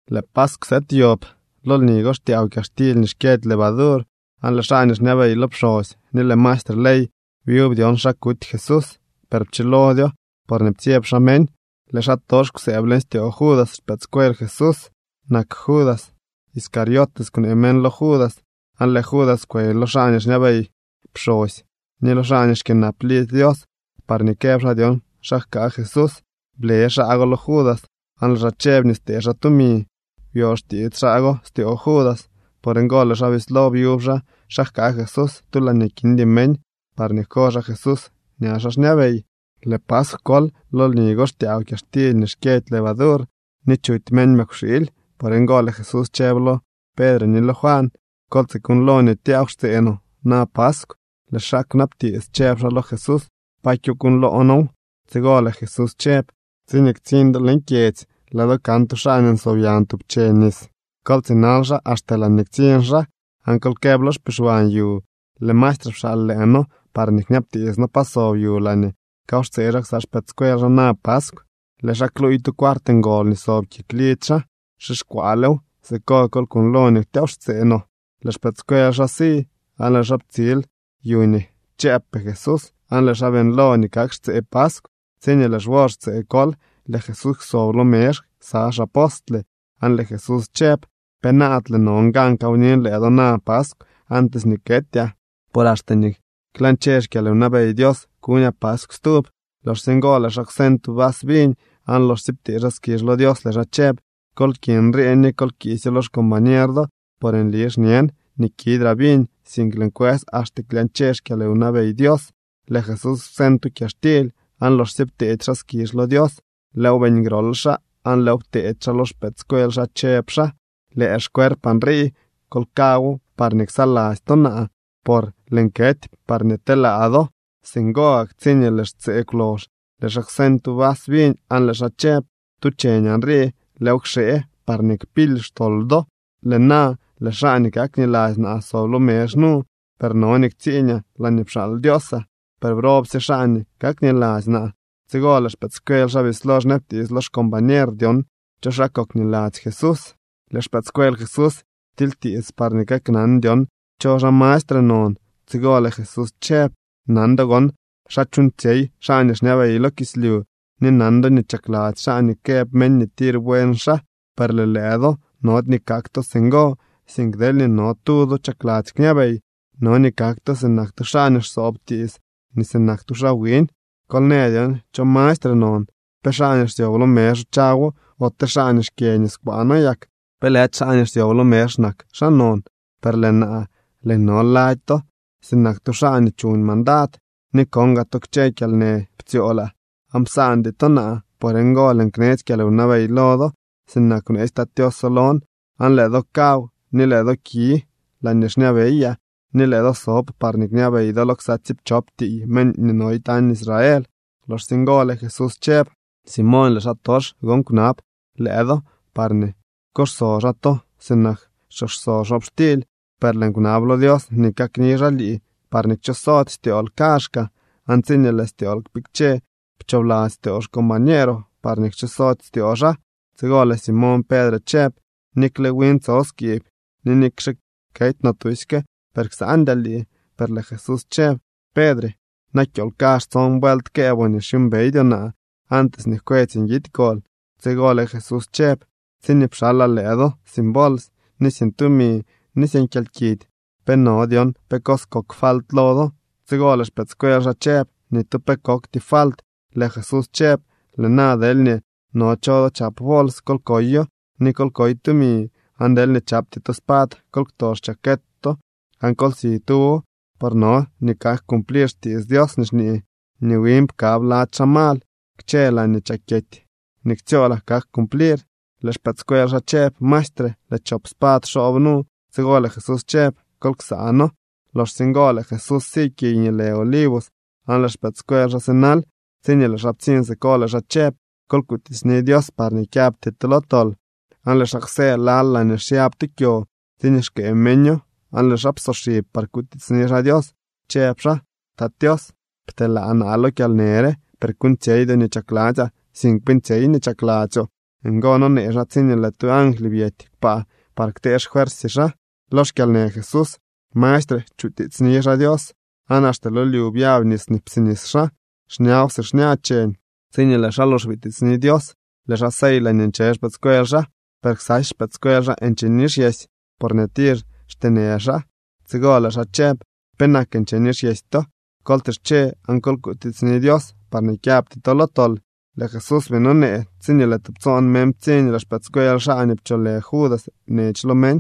Lëë paskw sëëd yob. Lo lni go xtyaaw kyaxtily nii xkyëdy levadur. Aan lëë xaa nii xñabey lo pxosy ni lëë maestre ley byub dyon xa kuty Jesús, per pchilodyo porñee ptsyeb xaa meñ. Lëë xaatox kwsëëb leñ styoo Judas. Xpëëdscuel Jesús nak Judas. Iscariote kwnee meñ lo Judas. Aan lëë Judas kwey lo xaa nii xñabey pxosy ni lo xaa nii xkyënap lidzy Dios parñee këb xaa dyon xa jkaa Jesús. Ble xaa go lo Judas, aan lëë xaa chëb nii stee xaa tumi. Byo xtiits xaa go styoo Judas. Por ngo lëë xaa bislo byub xaa xa jkaa Jesús tu laañee kindy meñ parñee jko xaa Jesús ña xaa xñabey. Lëë paskw kol. Lo lni go xtyaaw kyaxtily nii xkyëdy levadur, ni chuty meñ mëkwxiily. Por ngo lëë Jesús chëb lo Pedre ni lo Juan: —Kol tsikuuñlo nii tyaaw xtsee no na paskw. Lëë xaa kwnabtiits chëb xaa lo Jesús: —¿Pa kyokuuñloo noow? Tsigo lëë Jesús chëb: —Tsiñee ktsiñ do leñ kyedzy, lëë do kan tu xaa nii nsob yañ tub che nis. Kol tsinal xaa axte laañee ktsiñ xaa, aan kol këb lo xpixwan yu: “Lëë maestre pxaal lëë noo parñee kñabtiits noo pa sob yu laañee kawxtsee xaa ksa xpëëdscuel xaa na paskw.” Lëë xaa kluuy tu cuart ngol nii sob kik lidzy xaa, xixkwaalew. Siko kol kuuñlo nii tyaaw xtsee no. Lëë xpëëdscuel xaa si aan lëë xaa ptsil yu nii chëëbpee Jesús, aan lëë xaa beeñlo nii kak xtsee paskw. Tsiñee lëë xwor xtsee kol, lëë Jesús kwsob lo mezh ksa xaa apostle. Aan lëë Jesús chëb: —¡Penaadle non gan kawnin lëë do na paskw antes nii ketyaa! Por axte nii klañche xkyalwnabey Dios kuñaa paskw stub. Loxsye ngo lëë xaa kwseñ tu vas viñ, aan loxsye ptee xaa skizh lo Dios, lëë xaa chëb: —Kol ki nrii ni kol kiisyo lo xcombañer do. Por nli xñen nii kidraa viñ sink lëën kwës axte klyañche xkyalwnabey Dios. Lëë Jesús kwseñ tu kyaxtily, aan loxsye pteedy xaa skizh lo Dios, lëëw beeñ grol xaa, aan lëëw pteedy xaa lo xpëëdscuel xaa chëb xaa: —Lëë xcuerpaa nrii. Kol kawo parñee ksaladzy to naa, por lëën kety parñee telaa do. Singo gak tsiñee lëë xtsee kwlox, lëë xaa kwseñ tu vas viñ aan lëë xaa chëb: —Tu cheñaa nrii. Lëëw kxee parñee kpily xtol do. ’Lëë na lëë xaa nii kakniladzy naa sob lo mezh nu. Per no nii ktsiiñaa laañee pxaal Dios naa. Per ¡brobsye xaa nii kakniladzy naa! Tsigo lëë xpëëdscuel xaa bislo xñabtiits lo xcombañer dyon cho xaa kokniladzy Jesús. Lëë xpëëdscuel Jesús ptilytiits parñee kaknan dyon cho xaa mastre non. Tsigo lëë Jesús chëb: —Nan do gon xa chuuñtsyey xaa nii xñabey lo kislyu ni nan do nii chakladzy xaa nii këb meñ nii tir buen xaa. Per lëë lëë do nody nii kak to singo, sink deelñee no tu do chakladzy kñabey no nii kak to sinak tu xaa nii xsoob tiits ni sinak tu xaa wiñ. Kol në dyon cho mastre non, ¿pe xaa nii xsyob lo mezh chawo ote xaa nii xkyë niskwaano yak? ¿Pe lëdy xaa nii xsyob lo mezh nak xaa non? Per lëë naa, lëën no lady to sinak tu xaa nii chuñ mandad. ’Ni kon gaa to kchë kyalnë ptsyoolaa aan psaandy to naa. Por ngo lëën knetsy kyalwnabey lo do sinak nii bneetsy Tat Tioso lon, aan lëë do kaw ni lëë do ki laañee xñabeyaa ni lëë do sob parñee kñabey do lo ksa tsiipchop tiiy meñ nii no tañ Israel. Loxsye ngo lëë Jesús chëb: —Simoñ, lëë xaatox gon kwnab lëë do parñee kuxso xaa to sinak xchooxso xobxtily. Per lëën kwnab lo Dios nii kakni xaa lii, parñee kchosody styool kaazhkaa, aan tsiñee lëë styool kpikche, pchoobladzy styoo xcombañeeroo parñee kchosody styoo xaa. Tsigo lëë Simoñ Pedre chëb: —Nikle win tso skiib, ni nikxe kety no tusyke, per ksandyaa lii. Per lëë Jesús chëb: —Pedre, na kyool kazh tson vuelt këëboo nii xyuumbeydyoo naa antes nii jkwetsy nguidy kol. Tsigo lëë Jesús chëb: —Tsiñee pxalaa lëë do sin bols, ni sin tumi, ni sin kyalkidy, ¿pe no dyon pe cos kok falt lo do? Tsigo lëë xpëëdscuel xaa chëb: —Ni tu pe kokty falt. Lëë Jesús chëb: —Lëë na, deelñee no cho do chap bols, kol koyo, ni kol koy tumi. Aan deelñee chapty to spad, kol kto xchaket to aan kol si tuwo. Por no nii kak cumplir xkitsy Dios nii xñee nii win pkab lady xaa mal. Kchë laañee chakyety nii ktsyoolaa kak cumplir. Lëë xpëëdscuel xaa chëb: —Maestre, lëë chop spad xoob nu. Tsigo lëë Jesús chëb: —Kol ksaano. Loxsye ngo lëë Jesús si kiy nii lë Olivos aan lëë xpëëdscuel xaa sinal. Tsiñee lëë xaa ptsiñ siko, lëë xaa chëb: —Kol kutiitsni Dios parñee kyabty to lo tol. Aan lëë xaa kwsë lal laañee xyab tu kyo tsiñee xkëë meño, aan lëë xaa psoxib par kutiitsni xaa Dios, chëb xaa: —Tat Tios, pteelaa naa lo kyalnë re, per kuuñtsyeydyoo nii chakladzyaa, sink beeñtsyey nii chakladzyoo. Ngo nonee xaa tsiñee lëë tu angly byety kpaa par ktee xfuersy xaa. Lo xkyalnë Jesús mastre chutiitsni xaa Dios, aan axte lo lyu byab nis nii psinis xaa, xñaw si xña cheñ. Tsiñee lëë xaa lox bitiitsni Dios, lëë xaa sey laañee nche xpëëdscuel xaa. Per ksasy xpëëdscuel nche nixyesy, porñee tir xteenë xaa. Tsigo lëë xaa chëb: —¿Penak nche nixyesy to? Kol tsische aan kol kutiitsni Dios, parñee kyabty to lo tol. Lëë Jesús bii nonee, tsiñee lëë tubtsoon meñ ptsiñ. Lëë xpëëdscuel xaa nii pcholë Judas nech lo meñ,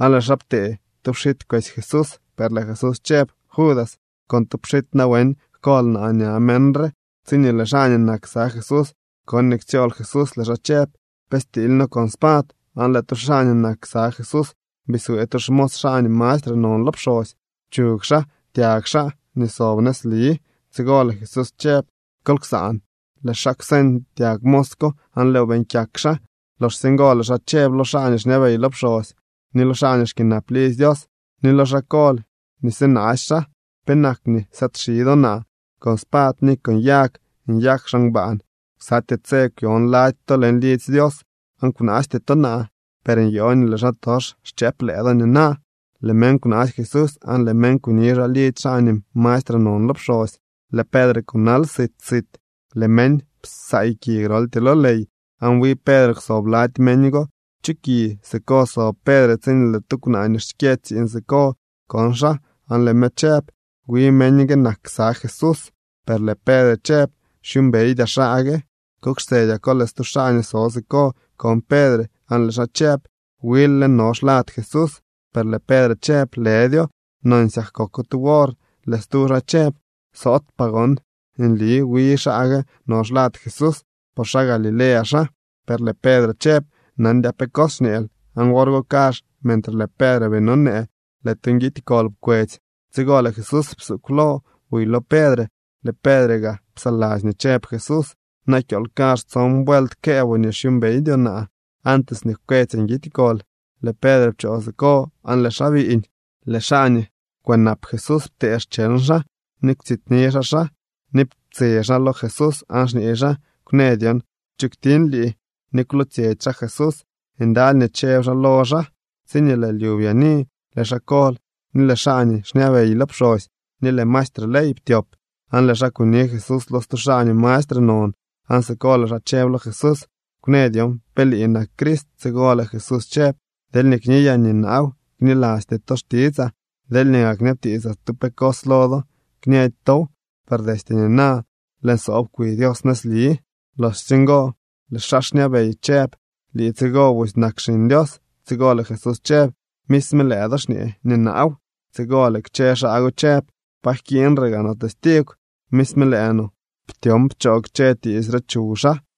aan lëë xaa ptee tu pxit kwesy Jesús, per lëë Jesús chëb: —Judas, ¿con tu pxit nawen jkol naa ña meñ re? Tsiñee lëë xaa nii nak ksa Jesús kon nii ktsyool Jesús, lëë xaa chëb: —¿Pe stiily noo con spad? Aan lëë tu xaa nii nak ksa Jesús biswee tu xmos xaa nii mastre non lo pxosy, pchug xaa tyag xaa nii sob nëzli. Tsigo lëë Jesús chëb: —Kol ksaan. Lëë xaa kwseñ tyag mos ko, aan lëëw beeñ kyak xaa. Loxsye ngo lëë xaa chëb lo xaa nii xñabey lo pxosy, ni lo xaa nii xkyënap lidzy Dios, ni lo xaa kol nii sinaasy xaa: —¿Penak nii sëëdxi do naa con spad ni yag nyak xaa ngbaan? Ksatyee tse kwyon lady to leñ lidzy Dios, aan kwnaasty to naa. Per nyoo nii lëë xaatox xchëëp lëë do nina. Lëë meñ kwnaasy Jesús, aan lëë meñ kuni xaa lidzy xaa nii mastre non lo pxosy. Lëë Pedre kunal sit sit. Lëë meñ psaay ki groltyee lo ley. Aan wi Pedre kwsob lady meñ go chu ki. Siko sob Pedre tsiñee lëë tu kwnaa nii xkyë tsiiñ siko kon xaa aan lëë me chëb: —Wi meñ gue nak ksa Jesús. Per lëë Pedre chëb: —Xyuumbeydyaa xaa gue. Kok xtsedyako, lëë stu xaa nii so siko kon Pedre, aan lëë xaa chëb: —Wil lë no xlad Jesús. Per lëë Pedre chëb: —Lëdyo. Nonsyak koko tu wor, lëë stu xaa chëb: —Soot paa gon nii wi xaa gue no xlad Jesús, por xaa Galilea xaa. Per lëë Pedre chëb: —Nandyaa pe cos xñeel. Aan wor go kazh, mentre lëë Pedre bii nonee, lëë tu nguidy kol pkwetsy. Tsigo lëë Jesús psuugw lo buy lo Pedre. Lëë Pedre gaa psaladzy nii chëb Jesús: “Na kyool kazh tson vuelt këëboo nii xyuumbeydyoo naa antes nii jkwetsy nguidy kol.” Lëë Pedre pchoo siko aan lëë xaa biiñ. Lëë xaa nii kwënap Jesús ptee xcheñ xaa ni kwtsityni xaa xaa. Ni ptse xaa lo Jesús, aan xñee xaa: —¡Kwnë dyon cho kwtiñ lii! Ni kwlootsyetsy xaa Jesús. Ndaly nii chëb xaa lo xaa. Tsiñee lëë lyu byaani lëë xaa kol ni lëë xaa nii xñabey lo pxosy ni lëë maestre ley ptyop, aan lëë xaa kuni Jesús lo stu xaa nii mastre non, aan siko lëë xaa chëb lo Jesús: —Kwnë dyon pe lii nak Crist. Tsigo lëë Jesús chëb: —Deelñee kniyaa na nii naaw, knilasty to xtitsaa. Deelñee gaa kñabtiitsaa tu pe cos lo do, kñëdy tow. Per destye nina lëën soob kwi Dios nëzli. Loxsye ngo lëë xaa xñabey chëb: —¿Lii tsigo busy nak Xiñ Dios? Tsigo lëë Jesús chëb: —Misme lëë do xñee nii naaw. Tsigo lëë kchë xaa go chëb: —¿Pa jkiiñre gaa no testigw? Misme lëë no ptyon pchoo kchë tiits re chuw xaa.